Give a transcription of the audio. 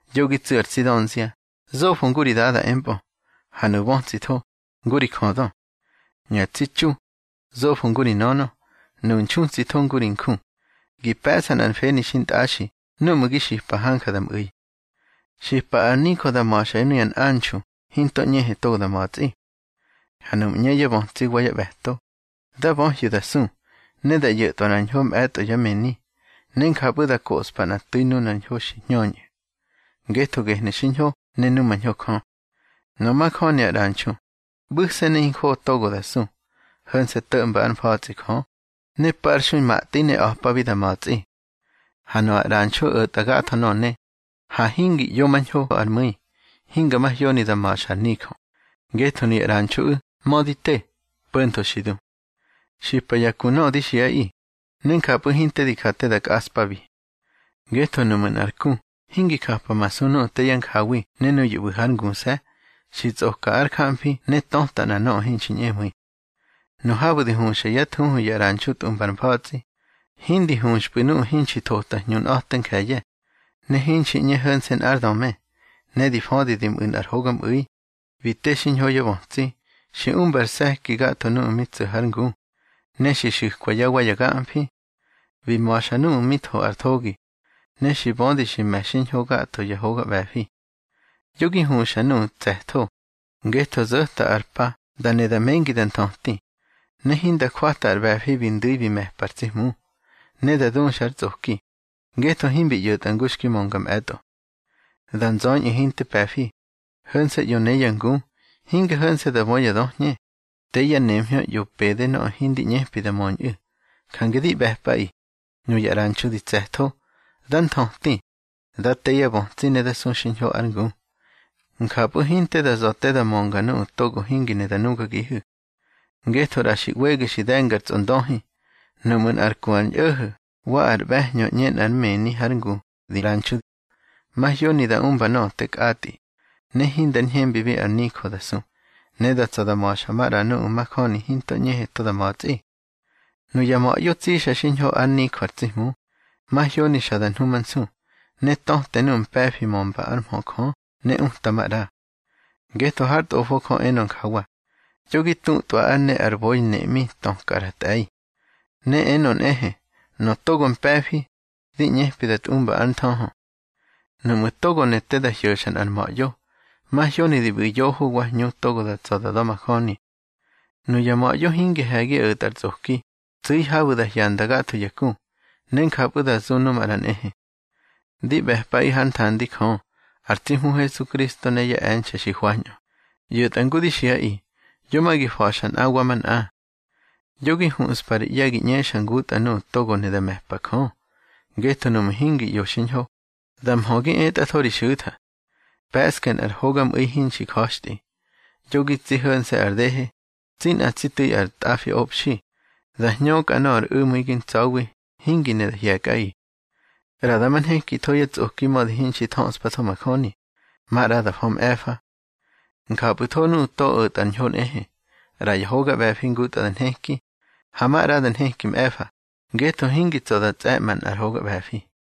Yo gi tsu̱ ar tsi dönzia, zofo ngu ri dada empꞌö, ha nuꞌu̱ bötsitho, ngu ri jödö. Nuya tsi txu, zofo ngu ri nönö, nuꞌu̱ nxutsitho ngu ri nju, gi pe̱ꞌsa nꞌar mfeni xintꞌaxi núꞌmu̱ gi xipa hanja da mꞌu̱i. Xipa ar nijö da ma̱xa nuya nꞌanxu hinto ꞌñehe togo da ma̱tsꞌi. Ha nuꞌmu̱ ꞌñe yá bötsi wa yá ꞌbe̱to, dá böhyu̱ da su, ne da ꞌyo̱tꞌwa ar ñho mꞌe̱tꞌo yá mëni. Ne njapꞌu̱ da koꞌspa nꞌa tu̱i nunar ñho xi hñöñꞌu̱, ngetho gehnu̱ xiñho ne numañho Jö. Nöꞌö majöni ar ꞌranxu, ꞌbu̱se̱ ne hinjoꞌo togo da su, ho̱nse̱ to̱ꞌmba ár mfa̱tsꞌi Jö, ne parxui matꞌi ne a̱pabi da ma̱tsꞌi. Ha nöꞌö ar ꞌranxu o̱tꞌa gatho nöꞌö ne, ha hingi ꞌyomañho ár mꞌu̱i, hinga mahyoni da ma̱xa ar nijö, ngetho nuya ꞌranxuꞌu̱ mödi te, po̱ntho xi du. Xipa ya ku nöꞌö di xiꞌaꞌi, ne njapꞌu̱ hinte di ja te da nkꞌaꞌspabi. Ngetho nuꞌmu̱ nꞌar ku hingi japamasu nuꞌu̱ te yá njawi ne nuyu̱ ꞌbu̱ hár nguse̱, xi tsꞌoka ár jamfi ne töta nꞌa nöꞌö hinxi ñꞌemu̱i. Nu habu̱ di huxa yá thuhu ya ꞌranxu tꞌumba ar mfa̱tsꞌi, hindi huxpꞌu̱ nuꞌu̱ hinxi thota hñunꞌa̱te nje̱ye̱, ne hinxi ꞌñe ho̱nse̱ nꞌár döme. Ne di födi bi mꞌu̱ nꞌar hogamꞌu̱i, bi te xiñho yá bötsi. Xi umba ar se̱ki gatho nuꞌu̱ mi tso̱ hár ngu, ne xi xu̱kwa yá wa ya gamfi. Bi ma̱xa nuꞌu̱ mi tho ar thogi, ne xi bödi xi me̱ xiñho gatho ya hoga ꞌbe̱fi. Yo gi huxa nuꞌu̱ tse̱tho, ngetho zo̱ta ar pa da ne da mengi da nthöti, ne hinda jwata ar ꞌbe̱fi bi ndu̱i bi me̱pa ar tsi Hmu. Ne da duxa ar tsꞌoki, ngetho himbi ꞌyo̱tꞌa ngu xki mönga mꞌe̱tꞌo. Da nzöñꞌu̱ hinte pe̱fi, ho̱nse̱ ꞌyo ne ya ngu. Hinge ho̱nse̱ da bö ya döhñe, te yá nemhñö ꞌyo pede ñoꞌö hindi ꞌñepi da möñꞌu̱. Jange di ꞌbe̱pꞌaꞌi, nuya ꞌranxu di tse̱tho, dá nthöti, dá te yá bötsi ne da su xiñho ár ngu. Njapꞌu̱ hinte da za̱ te da mönga nuꞌu̱ togo hingi ne da nugagihu̱. Ngetho ꞌra xi ꞌwege xi de̱nga ar Tsꞌondöhi. Nuꞌmu̱ nꞌar ku ar ñꞌo̱ho̱ wa ar ꞌbe̱hñö ꞌñe nꞌár mëni hár ngu di ꞌranxu, mahyoni da umba nöꞌö te kꞌatꞌi, ne hindar ñhembibi ar nijö da su, ne da tsa̱ da ma̱xa maꞌra nuꞌu̱ majöni hinto ꞌñehe to da ma̱tsꞌi. Nuya ma̱ꞌyo tsixa xiñho ár nijö ar tsi Hmu, mahyoni xa da nhumansu, ne töte nuꞌu̱ mpe̱fi mömba ár mhö Jö ne uta maꞌra. Ngetho hár Tꞌofo Jö enö njawa: Yo gi tutꞌwa ár ne ar boi neꞌmi töka ar tꞌe̱i. Ne enö nꞌehe: Nöꞌö togo mpe̱fi, di ꞌñepi da tꞌumba ár nthöhö. Nuꞌmu̱ togo ne te da hyo̱xa nꞌar ma̱ꞌyo, mahyoni di ꞌbu̱ yoho wa hñu togo da tsa̱ da da̱majöni. Nuya ma̱ꞌyo hingi he̱gi o̱tꞌa ar tsꞌoki, tsu̱i habu̱ da hyanda gatho ya ku, ne njapꞌu̱ da zu nu maꞌra nꞌehe. Di ꞌbe̱pꞌaꞌi hár nthandi Jö, ar tsi Hmu Hesukristo ne yá e̱nxe̱ xi hwañꞌö, ꞌyo̱tꞌa ngu di xiꞌaꞌi, yo ma gi fa̱xa nꞌa wa manꞌa. Yo gi huꞌspa ri ꞌye̱ gi ꞌñexa ngutꞌa nuꞌu̱ togo ne da me̱pa Jö. Ngetho nuꞌmu̱ hingi ꞌyo xiñho, da mhö gi etꞌatho ri xu̱tha. Pe̱ꞌske nꞌar hogamꞌu̱i hinxi ja̱xtꞌi. Yo gi tsi ho̱nse̱ ar dehe, tsi nꞌa tsi tu̱i ar tꞌafiꞌobxi, da hñökꞌa nöꞌö ar u̱mu̱i gi ntsa̱wi hingi ne da hye̱kꞌaꞌi. ꞌRa dama nhekitho yá tsꞌoki mödi hinxi thöꞌspatho majöni, maꞌra da fö mꞌe̱fa. Njapꞌu̱tho nuꞌu̱ to o̱tꞌa ar ñho nꞌehe, ꞌra ya hoga ꞌbe̱fi ngutꞌa da nheki, ha maꞌra da nheki mꞌe̱fa, ngetho hingi tsa̱ da tsꞌe̱ꞌma nꞌar hoga ꞌbe̱fi.